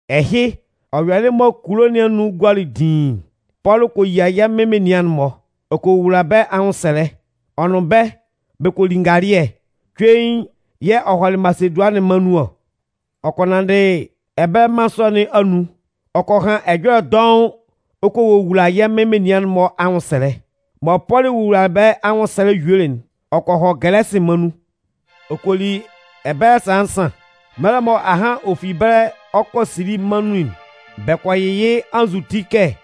Ɛhɩ, ɔ yɔlɩ mɔ kulo nɩn anun gualɩ diin'n, Pɔlʋ kɔ yia yɛ́ Mɩn menian'n-mɔ. Ɔ kɔ wowula bɛ́ anwʋnsɛlɛ, ɔ nʋn bɛ́, bɛ kɔ li ngalɩɛ, cuein yɛ̂ ɔ hɔlɩ Masedʋanɩn mân nun ɔ. Ɔ kɔ nanndɩ ɛbɛlɛ mân sɔ nɩn anun ɔ kɔ han ɛjɔlɛ dɔʋn ɔ kɔ wowula yɛ́ Mɩn menian'n-mɔ anwʋnsɛlɛ. Mɔ Pɔlʋ wowulalɩ bɛ́ anwʋnsɛlɛ yuelɩ'n, ɔ kɔ hɔ Gɛlɛsɩ mân nun ɔ kɔ li ɛbɛlɛ sala nsan. Mɛlɛ mɔ ahan ɔ fi ɛbɛlɛ ɔ 'kɔ Sili mân nun'n, bɛ kɔ yɩ yɩ́ anzʋti kɛ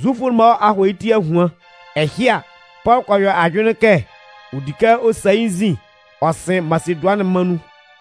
Zufʋ'n-mɔ a hɔ yɩ́ ti ahuan. Ɛhɩ a, Pɔlʋ kɔ yɔ ajʋnlɩn kɛ ɔ di kɛ ɔ sa yɩ́ nzin ɔ sɩn Masedʋanɩn mân nun.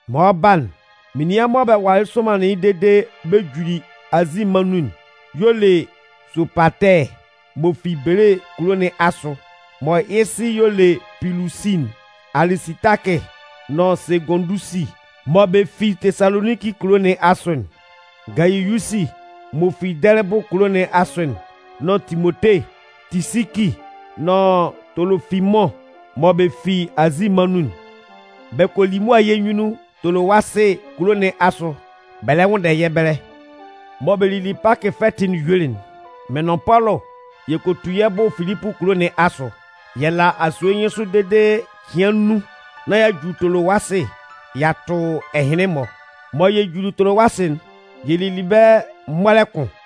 Mɔ ɔ 'ba'n, menian mɔ bɛ walɩ somanlɩn yɩ́ dede bɛ juli Azi mân nun'n y'ɔ le Sopatɛɛ m'ɔ fi Belee kulo nɩn asʋ mɔ yɩ́ sɩ y'ɔ le Pilusi'n, Alisitakɩ nʋn Segʋndusi mɔ bɛ fi Tesaloninki kulo nɩn asʋ'n, Gayiyusi m'ɔ fi Dɛlɩbʋ kulo nɩn asʋ'n nʋn Timote, Tisiki nʋn Tolofimʋn mɔ bɛ fi Azi mân nun'n. Bɛ kɔ li mʋa yɛ́ nyunnun Tolowasɩ kulo nɩn asʋ bɛ lɛ nwʋnndɛ yɛ́ ɛbɛlɛ. Mɔ bɛ lili Pakɩ fɛtɩ'n yuelɩ'n, mɩ́n nʋn Pɔlʋ yɛ kɔ tu yɛ́ bʋ Filipʋ kulo nɩn asʋ. Yɛ la asue nyɩnsʋ dede cɩan nnun nán y'a ju Tolowasɩ y'a tʋ ɛhɩnlɩn-mɔ. Mɔ yɛ juli Tolowasɩ'n, yɛ lili ɛbɛlɛ mɔlɛ kʋn.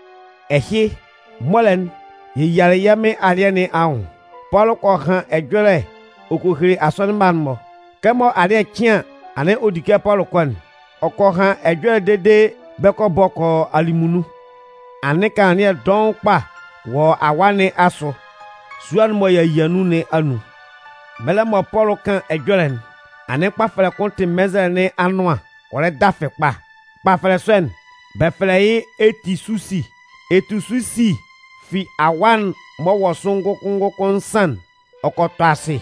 Ɛhɩ, mɔlɛ'n, yɛ yialɩ yɛ́ Mɩn alɩɛ nɩn anwʋn. Pɔlʋ kɔ han ɛjɔlɛ ɔ kɔ hele asɔnɩn mma'n-mɔ. Kɛmɔ alɩ́ɛ cɩn an, anɩn ɔ di kɛ Pɔlʋ kɔ'n, ɔ kɔ han ɛjɔlɛ dede bɛ kɔ bɔ kɔ yɔ alɩmunnun. Anɩn kanlannɩɛ dɔʋn kpa wɔ awaa nɩn asʋ sua'n mɔ y'a yia nun nɩn anun. Mɛlɛ mɔ Pɔlʋ 'kan ɛjɔlɛ'n, anɩn kpafɛlɛ kʋn tɩ mɛnzɛlɛ nɩn anʋan ɔ lɛ dafɩ kpa. Kpafɛlɛ sɔ'n, bɛ fɛlɛ yɩ́ Etisusi. Etisusi fi awaa'n m'ɔ wɔ sʋ ngʋkʋn ngʋkʋn nsan'n, ɔ kɔ tɔ asɩ.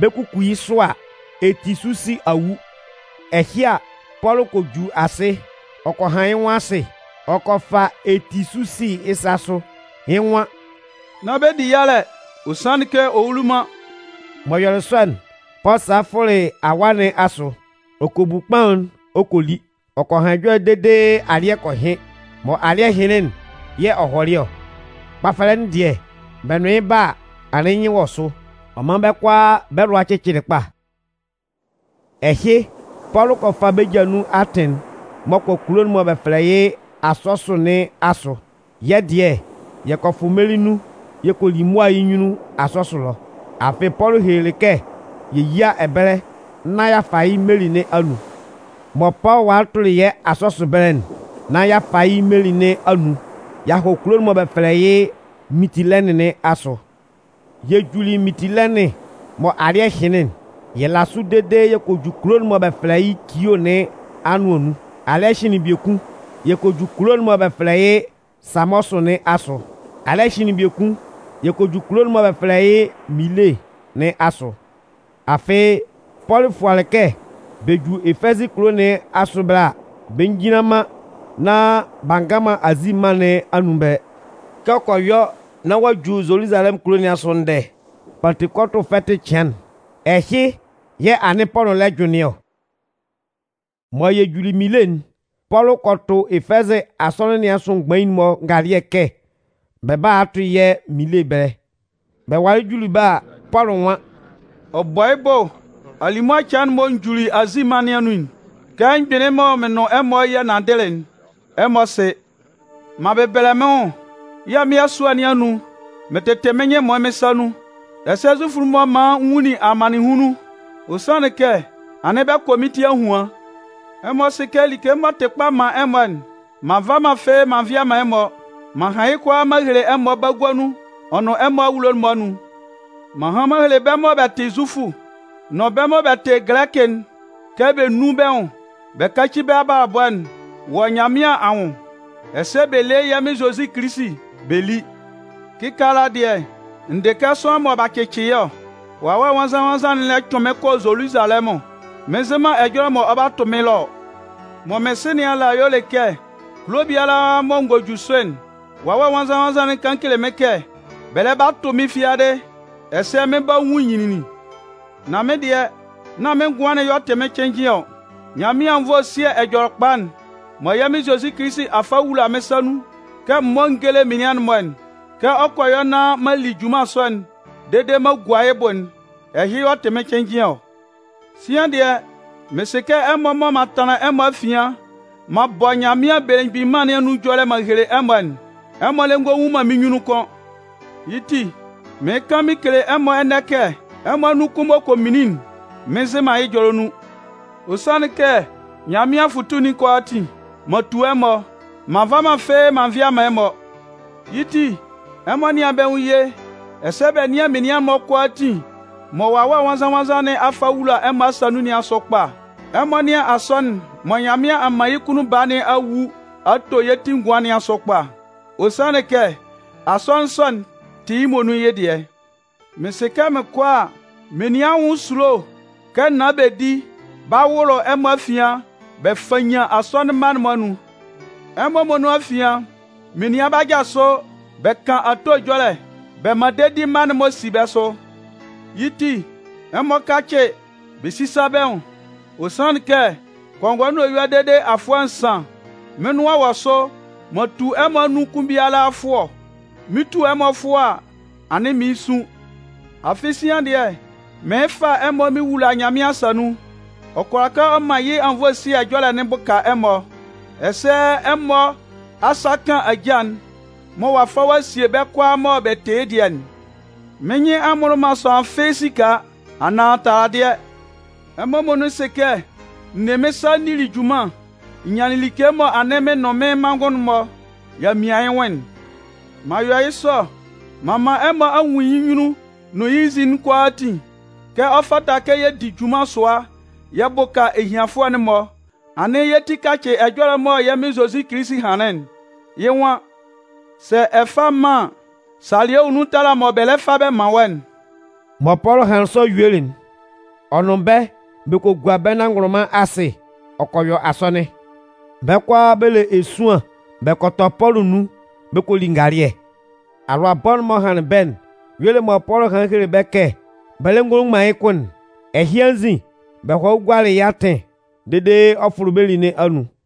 Bɛ 'kuku yɩ́ sʋ a, Etisusi a wu. Ɛhɩ a, Pɔlʋ kɔ ju asɩ ɔ kɔ han yɩ́ nwʋn asɩ ɔ kɔ fa Etisusi yɩ́ sa sʋ, yɩ́ nwan: “Nán bɛ di yalɛ, ɔ sanlɩn kɛ ɔ wuli man!” M'ɔ yɔlɩ sɔ'n, Pɔlʋ salɩ fʋlɩ awaa nɩn asʋ. Ɔ kɔ bu kpaʋn'n ɔ kɔ li. Ɔ kɔ han ɛjɔlɛ dede alɩ́ɛ kɔ hɩn. Mɔ alɩ́ɛ hɩnlɩn'n yɛ̂ ɔ hɔlɩ ɔ. Kpafɛlɛ'n dɩɛ, bɛ nʋn yɩ́ 'ba a, anɩn yɩ́ nyɩn wɔ sʋ. Ɔ man bɛ́ kʋalaa bɛ́ lʋa cɩcɩlɩ kpa. Ɛhɩ, Pɔlʋ kɔ fa bɛ́ ja nun atɩn'n m'ɔ kɔ kulo'n mɔ bɛ fɛlɛ yɩ́ Asɔsʋ nɩn asʋ. Yɛ́ dɩɛ, yɛ kɔ fʋ meli nun yɛ kɔ li mʋa yɩ́ nyunnun Asɔsʋ ɛlɔ. Afɩ Pɔlʋ helelɩ kɛ yɛ yía ɛbɛlɛ nán y'a fa yɩ́ meli nɩn anun. Mɔ Pɔlʋ walɩ tʋlɩ yɛ́ Asɔsʋ ɛbɛlɛ'n nán y'a fa yɩ́ meli nɩn anun y'a hɔ kulo'n mɔ bɛ fɛlɛ yɩ́ Mintilɛnɩn nɩn asʋ. Yɛ juli Mintilɛnɩn mɔ alɩ́ɛ hɩnlɩn'n, yɛ la sʋ dede yɛ kɔ ju kulo'n mɔ bɛ fɛlɛ yɩ́ Kio nɩn anʋan nun. Alɩ́ɛ hɩnlɩn biekun, yɛ kɔ ju kulo'n mɔ bɛ fɛlɛ yɩ́ Samɔsʋ nɩn asʋ. Alɩ́ɛ hɩnlɩn biekun, yɛ kɔ ju kulo'n mɔ bɛ fɛlɛ yɩ́ Minle nɩn asʋ. Afɩ Pɔlʋ fualɩ kɛ bɛ ju Efɛzɩ kulo nɩn asʋ ɛbɛlɛ a, bɛ njinlan man nán b'a nga man Azi mân nɩn anun ɛbɛlɛ. Kɛ ɔ kɔ yɔ nán ɔ'a ju Zoluzalɛmʋn kulo nɩn asʋ ndɛ Pantekɔtʋ fɛtɩ cɩan'n, ɛhɩ yɛ̂ anɩn Pɔlʋ lɛ jʋnlɩn ɔ. Mɔ yɛ juli Minle'n, Pɔlʋ kɔ tʋ Efɛzɩ asɔnɩn nɩn asʋ mgbain'n-mɔ ngalɩɛ kɛ bɛ bála a tʋ yɛ́ Minle ɛbɛlɛ. Bɛ walɩ juli ɛbɛlɛ a, Pɔlʋ nwan: “Ɔ bɔ yɩ́ bʋ alimʋa cɩan mɔ n juli Azi mân nɩn anun'n, kɛ m gbɩnlɩn mɩn nʋn ɛmɔ yɛ nanndɩlɩ'n, ɛmɔ sɩ. M'an bɛbɛlɛ mɩn nwʋn yɛ́ Mɩn ɛsʋ́ɛ nɩn anun, mɩn tɩtɩ mɩ́n nyɩn ɛmʋɩn mɩ́n sa nun, ɛsɛ Zufʋ'n-mɔ man n nwunlin amannɩnhunlun. Ɔ sanlɩn kɛ anɩn bɛ kɔ mɩ́n ti ahuan. Ɛmɔ sɩ kɛ like m'ɔ tɩ kpa man ɛmɔ'n, m'an va man fɩ́ɩ́ m'an vɩa man ɛmɔ. M'an han yɩ́ kʋalaa m'an hele ɛmɔ bagua nun ɔ nʋn ɛmɔ awulo'n-mɔ anun. M'an han m'an hele bɛ́ mɔ bɛ tɩ Zufʋ nʋn bɛ́ mɔ bɛ tɩ Gɛlɛkɩ'n kɛ bɛ nún bɛ́ nwʋn bɛ káci bɛ́ abalabɔ'n wɔ Nyanmɩan anwʋn ɛsɛ bɛ lé yɛ́ Mɩn Zozi Kilisi bɛ lí. “Kɩkaala dɩɛ, n dɩ kɛ sʋanlan mɔ b'a cɩcɩ yɩ́ ɔ, Wawɛ Nwannzan-nwannzan'n lɛ cʋɩn mɩ́n kɔ Zoluzalɛmʋn, mɩn nzɩ man ɛjɔlɛ mɔ ɔ 'ba tʋ mɩ́n ɛlɔ ɔ. Mɔ mɩn sɩ nɩn ala y'ɔ le kɛ, kulo biala mɔ n gɔ ju sʋ'n, Wawɛ Nwannzan-nwannzan'n kan kele mɩ́n kɛ bɛ lɛ ba tʋ mɩ́n fiadɩ ɛsɛ mɩn 'ba nwun nyinlinlin. Nan mɩ́n dɩɛ, nán mɩ́n ngʋan'n y'ɔ tɩ mɩ́n cɩnnjɩn ɔ. Nyanmɩan anwunnvoe ɛsɩ́ɛ Ɛjɔlɛkpa'n mɔ yɛ́ Mɩn Zozi a fa a wula mɩ́n sa nun kɛ m mɔ́ n géle menian'n-mɔ'n, kɛ ɔ kɔ yɔ nán m'an li junman sɔ'n dede m'an gua yɩ́ bʋ'n, ɛhɩ y'ɔ tɩ mɩn cɩnnjɩn ɔ. “Sian dɩɛ, mɩn sɩ kɛ ɛmɔ mɔ m'an tanlan ɛmɔ afian m'an bɔ Nyanmɩan Belemgbin Mân nɩn anwʋn ɛjɔlɛ m'an hele ɛmɔ'n, ɛmɔ lɛ ngɔ nwun man mɩ́n nyunnun kʋ́n. Yɩ́ ti, mɩɩn kan mɩn kele ɛmɔ ɛnɛ kɛ ɛmɔ anun kʋn m'ɔ kɔ minlin'n, mɩn nzɩ man yɩ́ ɛjɔlɛ nun. Ɔ sanlɩn kɛ Nyanmɩan afʋtu'n kʋalaatin, m'an tu ɛmɔ, m'an nva man fɩ́ɩ́ m'an nvɩa man ɛmɔ. Yɩ́ ti, ɛmɔ nɩ́an bɛ́ nwʋn ye ɛsɛ bɛ nɩ́an menian'n-mɔ kʋalaatin mɔ Wawɛ Nwannzan-nwannzan nɩn a fa a wula ɛmɔ asa nun nɩn asʋ kpa. Ɛmɔ nɩ́an Asɔnɩn'n mɔ Nyanmɩan a man yɩ́ kunnun Baa nɩn a wu a to yɩ́ ti ngʋan nɩn asʋ kpa. Ɔ sanlɩn kɛ Asɔnɩn sɔ'n tɩ yɩ́ muonun yɩ́ dɩɛ. “Mɩn sɩ kɛ mɩn kɔ a, menian anwʋn esulo kɛ naan bedi 'ba wʋlʋ ɛmɔ afian bɛ fannyan asɔnɩn mma'n-mɔ anun. Ɛmɔ muonun afian, menian 'ba jasʋ bɛ kan ato ɛjɔlɛ bɛ man dedi mma'n-mɔ si bɛ́ sʋ. Yɩ́ ti, ɛmɔ kácɩ bɛ sísa bɛ́ nwʋn. Ɔ sanlɩn kɛ, kɔngɔɛ nʋn eyua dede afʋɛ nsan, mɩ́n nʋan wɔ sʋ m'an tu ɛmɔ anun kʋn biala fʋɔ. Mɩn 'tu ɛmɔ fʋɔ a, anɩn mɩɩn sun. “Afɩ sian dɩɛ, mɩɩn fa ɛmɔ mɩn wula Nyanmɩan asa nun. Ɔ kʋala kɛ ɔ man yɩ́ anwunnvoe ɛsɩ́ɛ ɛjɔlɛ'n bʋka ɛmɔ, ɛsɛ ɛmɔ asa kan ajâ'n mɔ ɔ'a fa ɔ'a sie bɛ́ kʋalaa mɔ bɛ tɩ yɩ́ dɩɛ'n. Mɩ́n nyɩn a mmʋlʋ man sʋanlan fɩ́ɩ́ esika, anaan taladɩɛ. Ɛmɔ muonun sɩ kɛ n ne mɩ́n sa n nili junman n nyanlɩn like mɔ anɩn mɩn nʋn mɩ́n manngʋn'n-mɔ y'a mian yɩ́ nwʋn'n. M'an yɔ yɩ́ sɔ m'an man ɛmɔ a nwun yɩ́ nyunnun nʋn yɩ́ nzin'n kʋalaatin kɛ ɔ fata kɛ yɛ di junman sʋa yɛ bʋka ehianfʋɛ'n-mɔ. Anɩn yɛ́ ti kacɩ ɛjɔlɛ'n mɔ yɛ́ Mɩn Zozi hanlɩn'n. Yɩ́ nwan: ‘Sɛ ɛ fa man an, salɩɛ wɔ nun tala mɔ bɛ lɛ fa bɛ man wɔ́'n.’” Mɔ Pɔlʋ hanlɩn sɔ yuelɩ'n, ɔ nʋn bɛ́ bɛ kɔ gua bɛ́ nanngʋnlʋnman asɩ ɔ kɔ yɔ asɔnɩn. Bɛ́ kʋalaa bɛ le esuan bɛ kɔ tɔ Pɔlʋ nun bɛ kɔ li ngalɩɛ. Alʋabɔ'n m'ɔ hanlɩn bɛ́'n y'ɔ le mɔ Pɔlʋ hanlɩn hele bɛ́ kɛ bɛ lɛ ngɔ nwun man yɩ́ nwʋn kʋ́n'n. Ɛhɩ anzin, bɛ hɔlɩ gualɩ yɩ́ atɩn dede ɔ fʋlɩ meli nɩn anun.